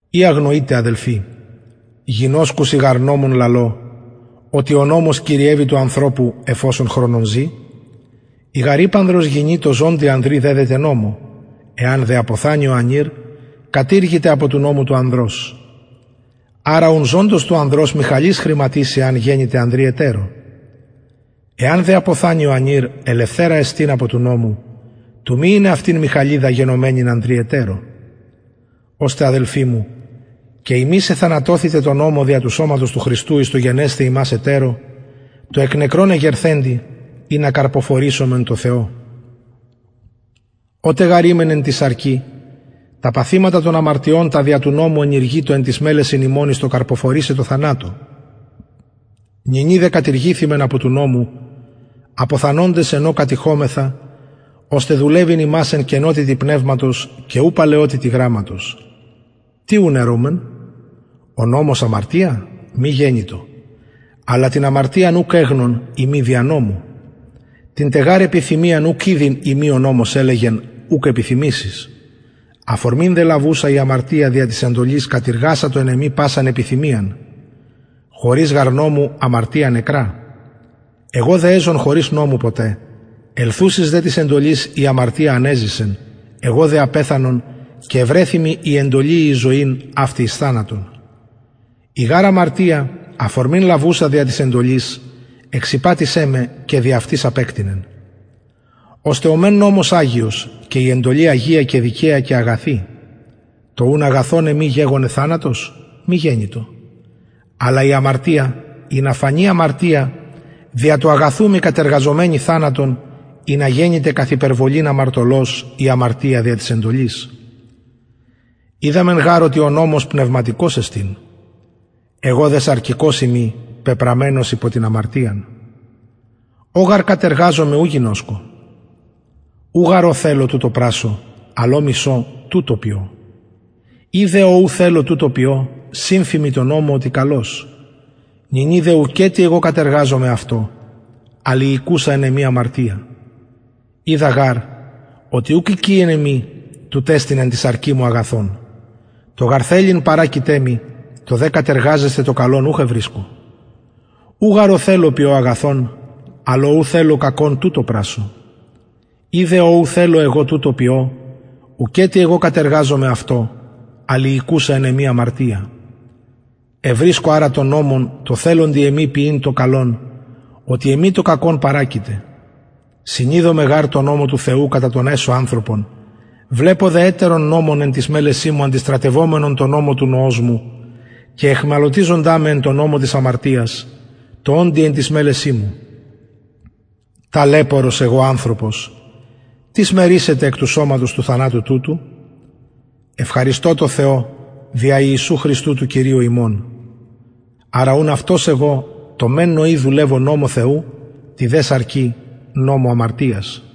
η αγνοειτε αδελφοι γινωσκουσιν γαρ νομον λαλω οτι ο νομος κυριευει του ανθρωπου εφ οσον χρονον ζη η γαρ υπανδρος γυνη τω ζωντι ανδρι δεδεται νομω εαν δε αποθανη ο ανηρ κατηργηται απο του νομου του ανδρος αρα ουν ζωντος του ανδρος μοιχαλις χρηματισει εαν γενηται ανδρι ετερω εαν δε αποθανη ο ανηρ ελευθερα εστιν απο του νομου του μη ειναι αυτην μοιχαλιδα γενομενην ανδρι ετερω ωστε αδελφοι μου και υμεις εθανατωθητε τω νομω δια του σωματος του χριστου εις το γενεσθαι υμας ετερω τω εκ νεκρων εγερθεντι ινα καρποφορησωμεν τω θεω οτε γαρ ημεν εν τη σαρκι τα παθηματα των αμαρτιων τα δια του νομου ενηργειτο εν τοις μελεσιν ημων εις το καρποφορησαι τω θανατω νυνι δε κατηργηθημεν απο του νομου αποθανοντες εν ω κατειχομεθα ωστε δουλευειν ημας εν καινοτητι πνευματος και ου παλαιοτητι γραμματος τι ουν ερουμεν ο νομος αμαρτια μη γενοιτο αλλα την αμαρτιαν ουκ εγνων ει μη δια νομου την τε γαρ επιθυμιαν ουκ ηδειν ει μη ο νομος ελεγεν ουκ επιθυμησεις αφορμην δε λαβουσα η αμαρτια δια της εντολης κατειργασατο εν εμοι πασαν επιθυμιαν χωρις γαρ νομου αμαρτια νεκρα εγω δε εζων χωρις νομου ποτε ελθουσης δε της εντολης η αμαρτια ανεζησεν εγω δε απεθανον και ευρεθη μοι η εντολη η εις ζωην αυτη εις θανατον η γαρ αμαρτια αφορμην λαβουσα δια της εντολης εξηπατησεν με και δι αυτης απεκτεινεν ωστε ο μεν νομος αγιος και η εντολη αγια και δικαια και αγαθη το ουν αγαθον εμοι γεγονεν θανατος μη γενοιτο αλλα η αμαρτια ινα φανη αμαρτια δια του αγαθου μοι κατεργαζομενη θανατον ινα γενηται καθ υπερβολην αμαρτωλος η αμαρτια δια της εντολης οιδαμεν γαρ οτι ο νομος πνευματικος εστιν εγω δε σαρκικος ειμι πεπραμενος υπο την αμαρτιαν ο γαρ κατεργαζομαι ου γινωσκω ου γαρ ο θελω τουτο πρασσω αλλ ο μισω τουτο ποιω ει δε ο ου θελω τουτο ποιω συμφημι τω νομω οτι καλος νυνι δε ουκετι εγω κατεργαζομαι αυτο αλλ η οικουσα εν εμοι αμαρτια οιδα γαρ οτι ουκ οικει εν εμοι τουτ εστιν εν τη σαρκι μου αγαθον το γαρ θελειν παρακειται μοι το δε κατεργαζεσθαι το καλον ουχ ευρισκω ου γαρ ο θελω ποιω αγαθον αλλ ο ου θελω κακον τουτο πρασσω ει δε ο ου θελω εγω τουτο ποιω ουκετι εγω κατεργαζομαι αυτο αλλ η οικουσα εν εμοι αμαρτια ευρισκω αρα τον νομον τω θελοντι εμοι ποιειν το καλον οτι εμοι το κακον παρακειται συνηδομαι γαρ τω νομω του θεου κατα τον εσω ανθρωπον βλεπω δε ετερον νομον εν τοις μελεσιν μου αντιστρατευομενον τω νομω του νοος μου και αιχμαλωτιζοντα με τω νομω της αμαρτιας τω οντι εν τοις μελεσιν μου ταλαιπωρος εγω ανθρωπος τις με ρυσεται εκ του σωματος του θανατου τουτου ευχαριστω τω θεω δια ιησου χριστου του κυριου ημων αρα ουν αυτος εγω τω μεν νοι δουλευω νομω θεου τη δε σαρκι νομω αμαρτιας